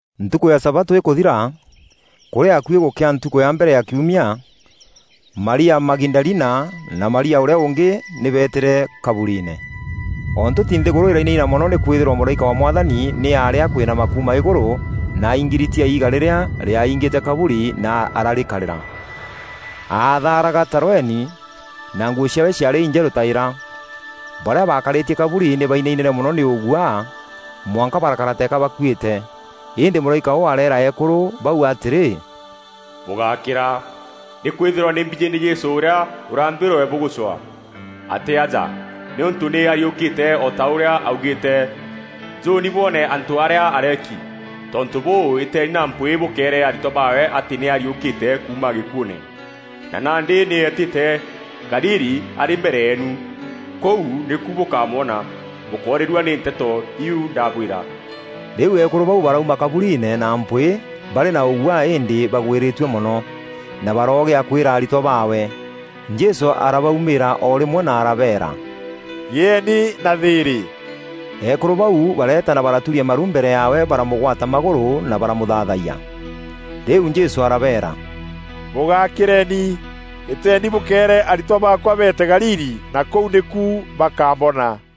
Ntukû ya sabatû îkûthira, kûrî akuî gûkea ntukû ya mbere ya kiumia, Maria Magidalina na Maria ûrîa ûngî nî beetîre kaburiine. O ntûti nthîgûrû îrainaina mono nîkwîthîrwa mûraîka wa Mwathani nî aarî akwinama kuuma îgûrû na aingiritia iiga rîrîa rîaingîte kaburi na ararîkarîra. Aatharaga ta rweni, na nguû ciaawe ciaarî injerû ta îra. Barîa baakarîtie kaburi nî bainainîre mono nî ûguaa, mwanka barakara teeka baakuîte. Îndî mûraîka ûu areera eekûrû bau atîrî, “Bûgákîra! Nîkwîthîrwa nî mbijî nî Jesû ûrîa ûraambîrwe bûgûcwaa. Atî aja, nîûntû nî ariûkîre o ta ûrîa aaugîîte. Njûûni bwoone antû arîa areeki. Tontû bûû, îteeni na mpwîî bûkeere aritwa baawe atî nî ariûkîte kuuma gîkuûûne, na nandî nî etîte Galili arî mbere yeenu. Kûu nîku bûkamwona. Bûkórîrua nî nteto iu ndabwîra.” Rîu eekûrû bau barauma kaburiine na mpwîî barî na ûguaa îndî bagwîrîtue mono, na baroogîa kwîra aritwa baawe. Jesû arabaumîîra o rîmwe na arabeera, “Gîeeni na thîîrî!” Eekûrû bau bareeta na baraturia maru mbere yaawe baramûgwata magûrû na baramûthaathayia. Rîu Jesû arabeera, “Bûgakîreeni! Îteeni bûkeere aritwa baakwa beete Galili na kûu nîku bakambona.”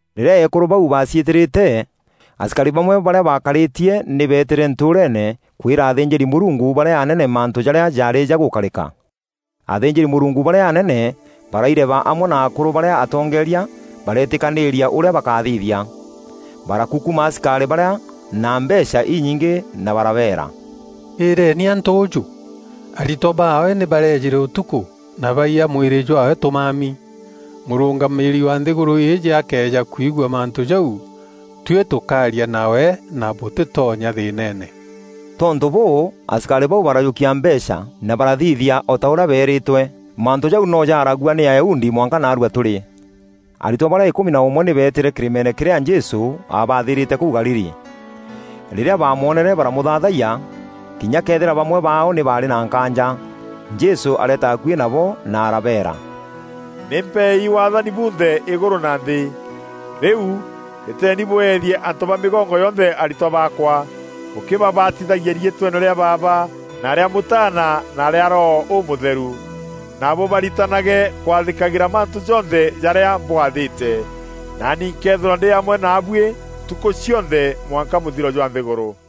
Rîrîa eekûrû bau baaciîtîrîte, asikarî bamwe barîa baakarîtie nî beetîre ntûûreene kwîra athînjîri-Mûrungu barîa anene mantû jarîa jaarî jagûkarîka. Athînjîri-Mûrungu barîa anene baraireba amwe na akûrû barîa atongeeria bareetîkanîîria ûrîa bakathithia. Barakukuma asikarî barîa na mbeecha inyingî na barabeera, “Îreeni antû ûjû: ‘Aritwa baawe nî bareejîre ûtukû, na baiya mwîrî jwaawe tûmami.’ Mûrûngamîîri wa nthîgûrû îîjî akëeja kwigua mantû jau, tuî tûkaaria nawe na bûtîtonya nthîîneene.” Tontû bûû asikarî bau barajûkia mbeecha na barathithia o ta ûrîa beerîtûe. Mantû jau no jaaragua nî Ayahudi mwanka naarua tûrî. Aritwa barîa îkûmi na ûmwe nî beetîre kîrîmeene kîrîa Jesû aabathîîrîte kûu Galili. Rîrîa baamwonere baramûthaathayia kinya këethîra bamwe baao nî baarî na nkaanja. Jesû areeta akuî nabo na arabeera, “Nî mpeei waathani bunthe îgûrû na nthî. Rîu, îteeni bweethie antû ba mîgongo yonthe aritwa baakwa, bûkîbabatithagia riîtweene rîa Baaba, na rîa Mûtaana na rîa Roho Ûmûtheru, na bûbaritanage kwathîkagîra mantû jonthe jarîa mbwaathîte. Naani nkeethîrwa ndî amwe naabuî ntukû cionthe mwanka mûthiro jwa nthîgûrû.”